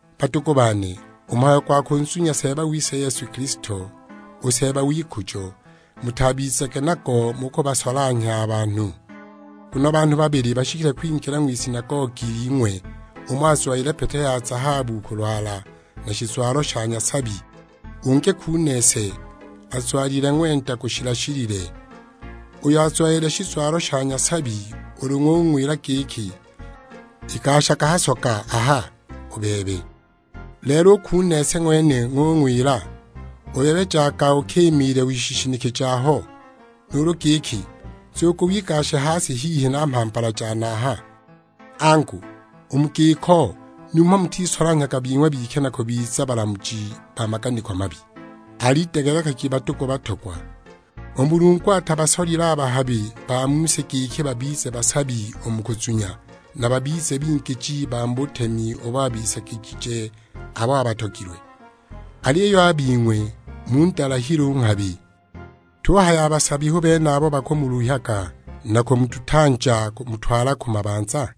Badugu bane, u mhayo gwa kunzunya Seeba wise Yesu Kilisto, u Seeba w'ikujo, mutabizage nago mu kubasolanhya a banhu. Nguno banhu babili bashikile kwingila ng'wisinagogi ling'we; umo azwalile pete ya zahabu ku lwala, na shizwalo sha nyasabi; ungi kunese, azwalile ng'wenda gushila-shilile. Uyo azwalile shizwalo sha nyasabi ulu ng'ung'wila giki, "Igashaga a ha soga aha u bebe." Lelo u kunese ng'wene ng'ung'wila, "U bebe jaga ukimiile wishishinike aho." Nuulu giki, "Nzugu wigashe ha si, hihi na mhambala jane aha!" Angu, u mu giko numho mutisolanhyaga bing'we bike, na kubiza balamuji ba maganiko mabi? Alidegelekagi badugu batogwa, u Mulungu atabasolile a bahabi ba mu si giki babize basabi u mu kuzunya, na babize bingiji ba mu butemi ubo abisagigije abo abatogilwe! Aliyo a bing'we mundalahile u nghabi! Tuhaya a basabi hu bene abo bakamuluhyaga, na kumudutanja kumutwala ku mabanza?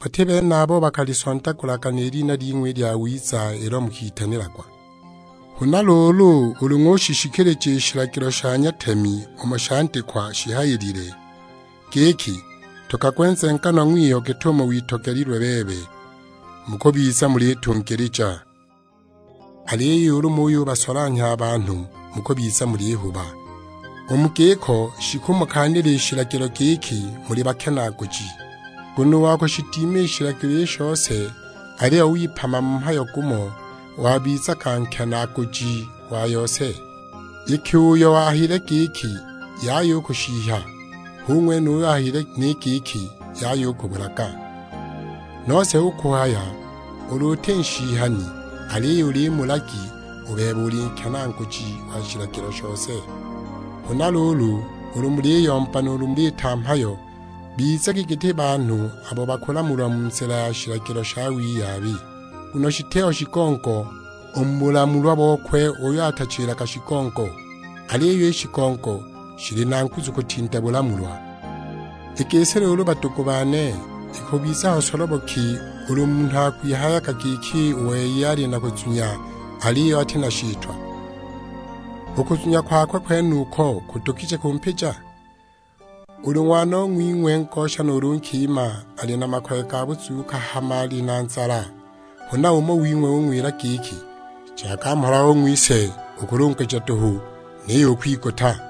Bati bene abo bakalisondagulaga ni lina ling'we i lyawiza ilo mukitanilagwa? Huna luulu ulu ng'ushishikilija i shilagilo sha nyatemi umo shandikwa shihayilile giki, "Ntogagwe nzenganwa ng'wiyo git'umo witogelilwe bebe," mukubiza mulitungilija. Aliyo ulu muyubasolanhya a banhu, mukubiza mulihuba; u mu giko shikumukaanila i shilagilo giki muli bakenaaguji. Nguno u wa kushidima i shilagilo i shose aliyo wipama mu mhayo gumo, wabizaga nkenaaguji wa yose. Iki uyo ahayile giki, "Yaya u kushihya," hu ng'wene uyo ahayile ni giki, "Yaya u kubulaga." Nose hu kuhaya ulu uti nshihani aliyo uli mulagi, u bebe uli nkenaaguji wa shilagilo shose. Huna luulu, ulu muliyomba nuulu muliita mhayo, bizagi giti banhu abo bakulamulwa mu nzila ya shilagilo sha wiyabi. Nguno shitiho shigongo u mu bulamulwa bokwe uyo atachilaga shigongo; aliyo i shigongo shili na nguzu kutinda bulamulwa. I gisi luulu badugu bane, ikubiza ho solobo ki ulu munhu akwihayaga giki u wei ali na kuzunya, aliyo ati na shitwa. U kuzunya kwakwe kwenuko kudugije kumpija? Ulu ng'wanong'wing'we ngosha nuulu nkima ali na makoye ga buzuuka hama ali nzala; huna umo wing'we ung'wila giki, "Jaga mhola ong'wise, ukulunguja duhu, niyo ukwiguta!"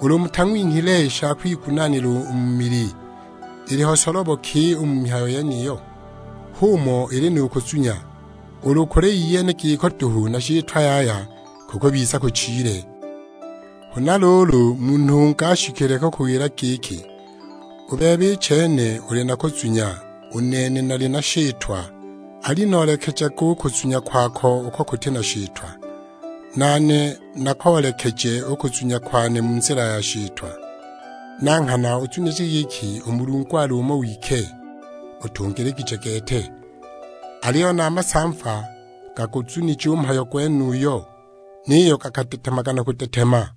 Ulu mutang'winhile i sha kwigunaanila u mu mili, iliho solobo ki u mu mihayo yeniyo? H'umo ili nu kuzunya, ulu kuli iyene giko duhu na shitwa yaya, kukubiza kuchile! Huna luulu munhu ungi ashikile kukuwila giki, "U bebe i chene uli na kuzunya, u nene nali na shitwa;" alinoolekejage u kuzunya kwako uko kuti na shitwa, nane nakoolekeje u kuzunya kwane mu nzila ya shitwa! Na nghana uzunije giki u Mulungu ali umo wike, utungiligije gete; aliyo na a masamva gaguzunije u mhayo gwenuyo, niyo gakadetemaga na kudetema!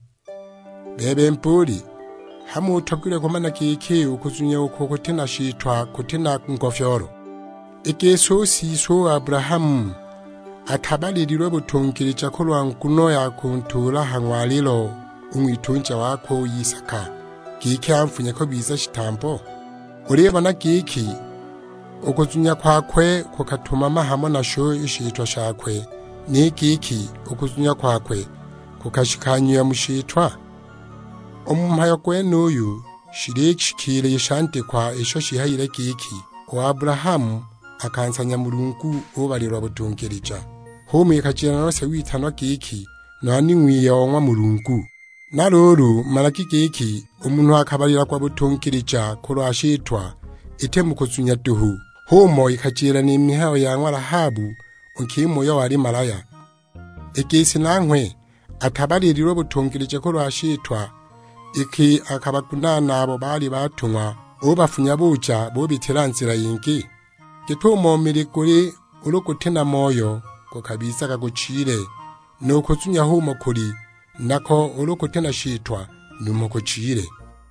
Bebe mbuuli, hamo utogilwe kumana giki u kuzunya uko kuti na shitwa kuti na ngofyoolo? I gisi u siswe u Abulahamu atabalililwe butungilija kulwa nguno ya kuntuula ha ng'walilo u ng'witunja wakwe u Isaka, giki anfunye kubiza shitambo? Ulibona giki u kuzunya kwakwe kukatumama hamo nasho i shitwa shakwe, ni giki u kuzunya kwakwe kukashikanyiwa mu shitwa? U mu mhayo gwenuyu shilishikiila i shandikwa isho shihayile giki, "U Abulahamu akansanya Mulungu ubalilwa butungilija." H'umo ikajila nose witanwa giki nwani ng'wiye o ng'wa Mulungu. Na luulu managi giki, u munhu akabalilagwa butungilija kulwa shitwa, iti mu kuzunya duhu. H'umo ikajila ni mihayo ya ng'wa Lahabu, u nkima uyo wali malahya. I gisi nanghwe atabalililwe butungilija kulwa shitwa, iki akabagunaana abo baali batung'wa, ubafunya buja, bubitila nzila yingi? Git'umo mili guli, ulu guti na moyo gukabizaga guchile; nu kuzunya h'umo kuli, nako ulu kuti na shitwa numho kuchile!